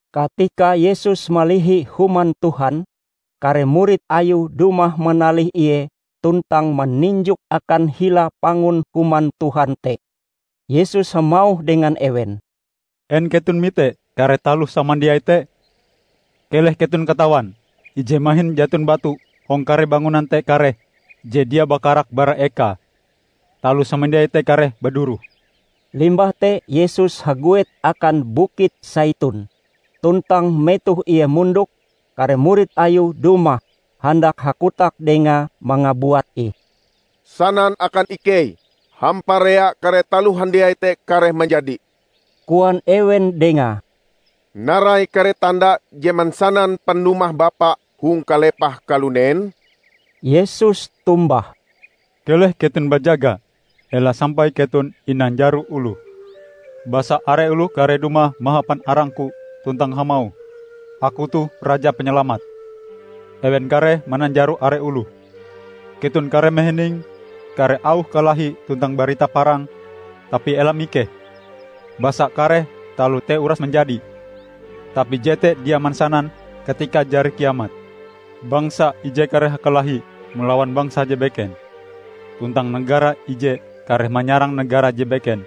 Katika Yesus malihi Human Tuhan, kare murid Ayue dumah manalih Ie tuntang maninjok akan hila pangun Human Tuhan te. Yesus hamauh dengan ewen, "En keton mite kare taloh samandiai te? Keleh keton katawan, ije mahin jaton batu hong kare bangunan te kareh je dia bakarak bara ekae. Taloh samandiai te kareh baduroh." Limbah te Yesus haguet akan Bukit Saitun, tuntang metoh Ie mondok, kare murid Ayue dumah handak hakotak Dengae mangabuat ih. "Sanan akan ikei hamparea kare taloh handiai te kareh manjadi," koan ewen Dengae. "Narai kare tanda je mansanan panumah Bapa hong kalepah kalunen?" Yesus tombah, "Keleh keton bajaga, ela sampai keton inanjaro oloh. Basa are oloh kareh dumah mahapan arang-Ku tuntang hamauh, 'Aku toh Raja Panyalamat!' Ewen kareh mananjaro are oloh. Keton kareh mahining kare auh kalahi tuntang barita parang, tapi ela mikeh. Basa kare taloh te uras manjadi, tapi jete dia mansanan katikae jari kiamat. bangsa ije kareh hakalahi malawan bangsa je beken, tuntang negara ije kareh manyarang negara je beken.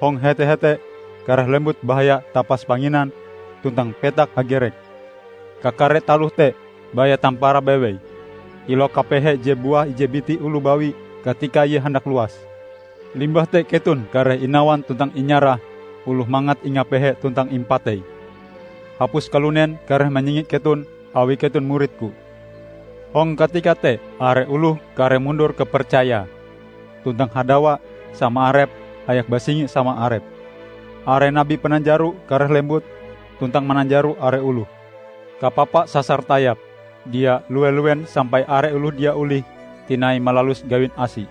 Hong hete-hete kareh lembut bahaya tapas panginan tuntang petak hagerek. Kakare taloh te baya tamparae bewei, kilau kapehe je buah ije biti oloh bawi katika ie handak luas. Limbah te keton kareh inawan tuntang inyarah oloh mangat ingapehe tuntang impatei. Hapus kalunen kareh manyingi keton awi keton murid-Ku. Hong katika te are oloh kareh mundur kapercayae, tuntang hadawa sama arepe hayak basingi sama arepe. Are nabi pananjaro kareh lembut, tuntang mananjaro are oloh. Kapapa sasar tayap dia lue-luen sampai are oloh dia olih tinai malalus gawin asi.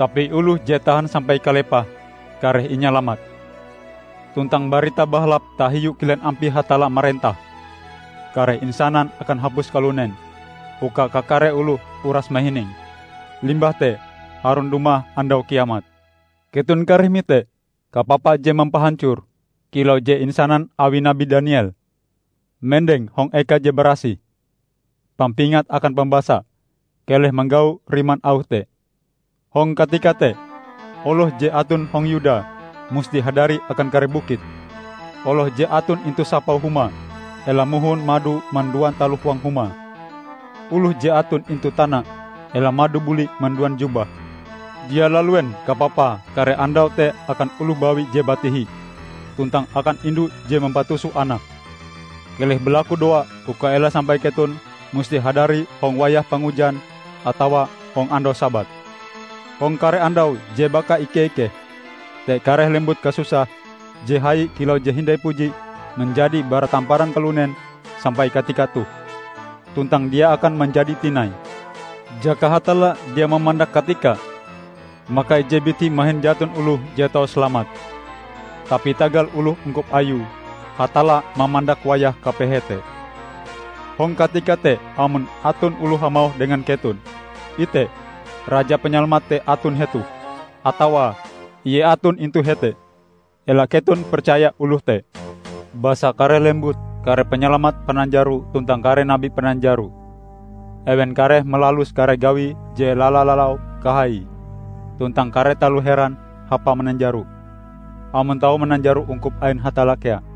Tapi oloh je tahan sampai kalepahe, kareh inyalamat. Tuntang Barita Bahalap tahiu kilen ampie Hatalla marentah, kareh insanan akan hapus kalunen, uka kakare oloh uras mahininge. Limbah te harun dumah andau kiamat." "Keton kareh mite 'Kapapa je mampahancor', kilau je insanan awi Nabi Daniel, mendeng hong eka je barasih. (Pampingat akan pambasa: Keleh manggau riman auh te!) Hong katika te, oloh je aton hong Yuda musti hadari akan kare bukit. Oloh je aton intu sapau huma ela mohon mado manduan taloh huang huma. Oloh je aton intu tana ela mado buli manduan jubahe. Dia laluen kapapae kare andau te akan oloh bawi je batihi, tuntang akan indu je mampatuso anake! Keleh balakudoa uka ela sampai keton musti hadari hong wayah pangujan atawa hong andau Sabat! Hong kare andau je bakaike-ikeh te kareh lembut kasusah je hai kilau je hindai puji manjadi bara tamparan kalunen sampai katika toh, tuntang dia akan manjadi tinai. Jaka Hatalla dia mamandak katikae; maka ije biti mahin jaton oloh je tau salamat. Tapi tagal oloh ungkup Ayue, Hatalla mamandak wayah kapehe te. Hong katika te amon aton oloh hamauh dengan keton, 'Ite, Raja Panyalamat te aton hetoh!' atawa 'Ie aton intu hete!' -- ela keton percaya oloh te. Basa kareh lembut kare panyalamat pananjaro tuntang kare nabi pananjaro. Ewen kareh malalus kare gawi je lala-lalau kahaie, tuntang kare taloh heran hapa mananjaro, amon tau mananjaro ungkup ain Hatalla kea.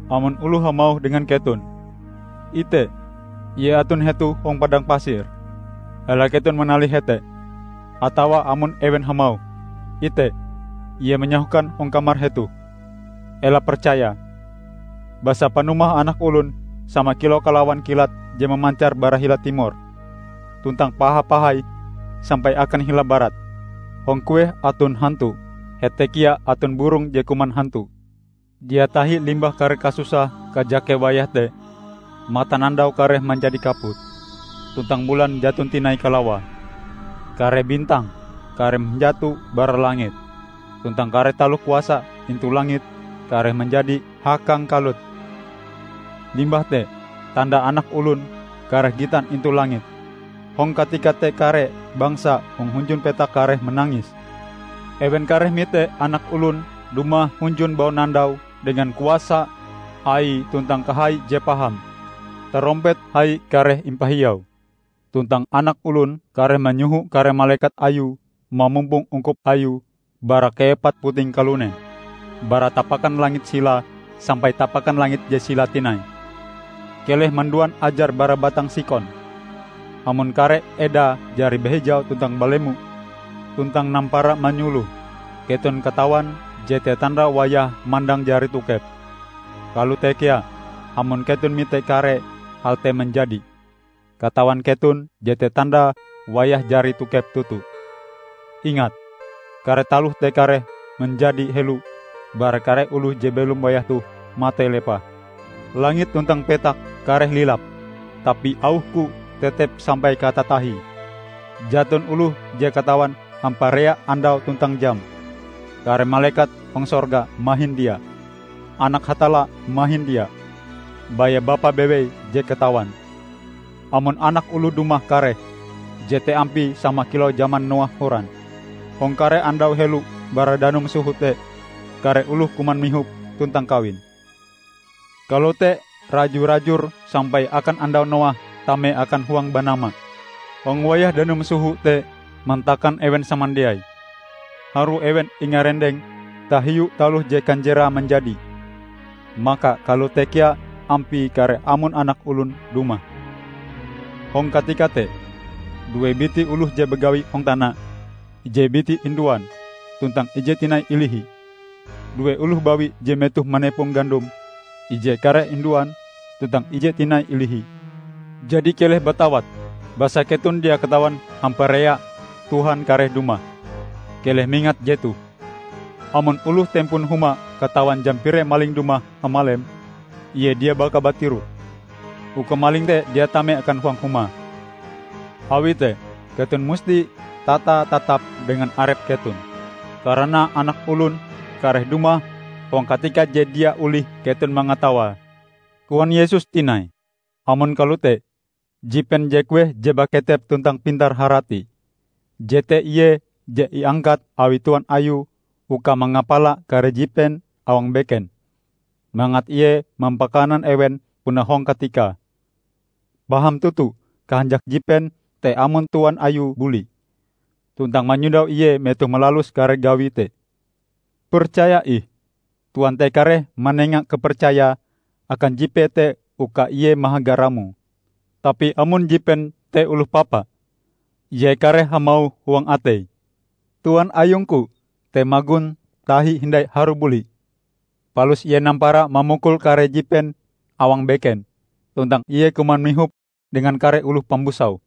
Amon oloh hamauh dengan keton, 'Ite, Ie aton hetoh hong padang pasir!' -- ela keton manalih hete. Atawa amon ewen hamauh, 'Ite, Ie manyahokan hong kamar hetoh!' -- ela percayae. Basa panumah Anak Olon sama kilau kalawan kilat je mamancar bara hila timor, tuntang paha-pahai sampai akan hila Barat. Hong kueh aton hantu, hete kea aton burong je kuman hantu." "Dia tahi limbah kare kasusah kajake wayah te, matanandau kareh manjadi kaput, tuntang bulan jaton tinai kalawae. Kare bintang kareh manjato bara langit, tuntang kare taloh kuasa intu langit kareh manjadi hakangkalut. Limbah te tanda Anak Olon kareh gitan intu langit. Hong katika te kare bangsa hong hunjun petak kareh manangis. Ewen kareh mite Anak Olon dumah hunjun baunandau dengan kuasan Aie tuntang kahaie je paham. Tarompet hai kareh impahiau, tuntang Anak Olon kareh manyoho kare malekat Ayue mamumpong ungkup Ayue bara kaepat puting kalunen, bara tapakan langit silae sampai tapakan langit je silae tinai." "Keleh manduan ajar bara batang sikon. Amon kare edae jari bahijau tuntang balemo, tuntang nampara manyuloh, keton katawan jete tanda wayah mandang jari tokep. Kalote kea amon keton mite kare hal te manjadi, katawan keton jete tandae wayahe jari tokep toto. Ingat! Kare taloh te kareh manjadi helo bara kare oloh je belom wayah toh matei lepah. Langit tuntang petak kareh lilap, tapi auh-Ku tetep sampai katatahie." "Jaton oloh je katawan hamparea andaue tuntang jame, kare malekat hong sorga mahin dia, Anak Hatalla mahin dia, baya Bapa bewei je katawan. Amon Anak Olon dumah kareh, jete ampie sama kilau jaman Noah horan. Hong kare andau helo bara danum soho te, kare oloh kuman mihop, tuntang kawin. Kalote raju-rajur sampai akan andau Noah tame akan huang banama. Hong wayah danum soho te mantakan ewen samandiai, harue ewen ingarendeng tahiu taloh je kanjerae manjadi. Maka kalote kea ampie kareh amon Anak Olon dumah. Hong katika te, due biti oloh je bagawi hong tana: ije biti induan, tuntang ije tinai ilihi. Due oloh bawi je metohe manepong gandom: ije kareh induan, tuntang ije tinai ilihi. Jadi keleh batawat, basa keton dia katawan hamparea Tuhan kareh dumah. Keleh mingat jetoh! Amon oloh tempon huma katawan jam pire maling dumah hamalem, ie dia baka batiroh, uka maling te dia tame akan huang humae. Awi te, keton musti tata-tatap dengan arep keton. Karana Anak Olon kareh dumah hong katika je dia olih keton mangatawae." Koan Yesus tinai, "Amon kalote, jipen je kueh je baketep tuntang pintar harati? Jete ie je iangkat awi tuan ayue uka mangapala kare jipen awang beken, mangat ie mampakanan ewen puna hong katikae. Paham toto kahanjak jipen te amon tuan ayue buli, tuntang manyondau ie metohe malalus kare gawie te. Percaya ih, tuan te kareh manenga kapercayae akan jipee te uka ie mahaga ramoe. Tapi amon jipen te oloh papa, ie kareh hamauh huang ateie, 'Tuan ayung-Ku te magon tahi hindai harue buli,' palus ie nampara mamukul kare jipen awang beken, tuntang ie kuman mihop dengan kare oloh pambusau.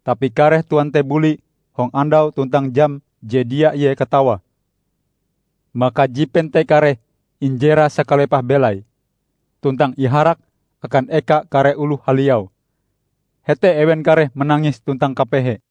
Tapi kareh tuan te buli hong andau tuntang jam je dia ie katawae. Maka jipen te kareh injerae sakalepah belaie, tuntang iharak akan eka kare oloh haliau. Hete ewen kareh manangis tuntang kapehe."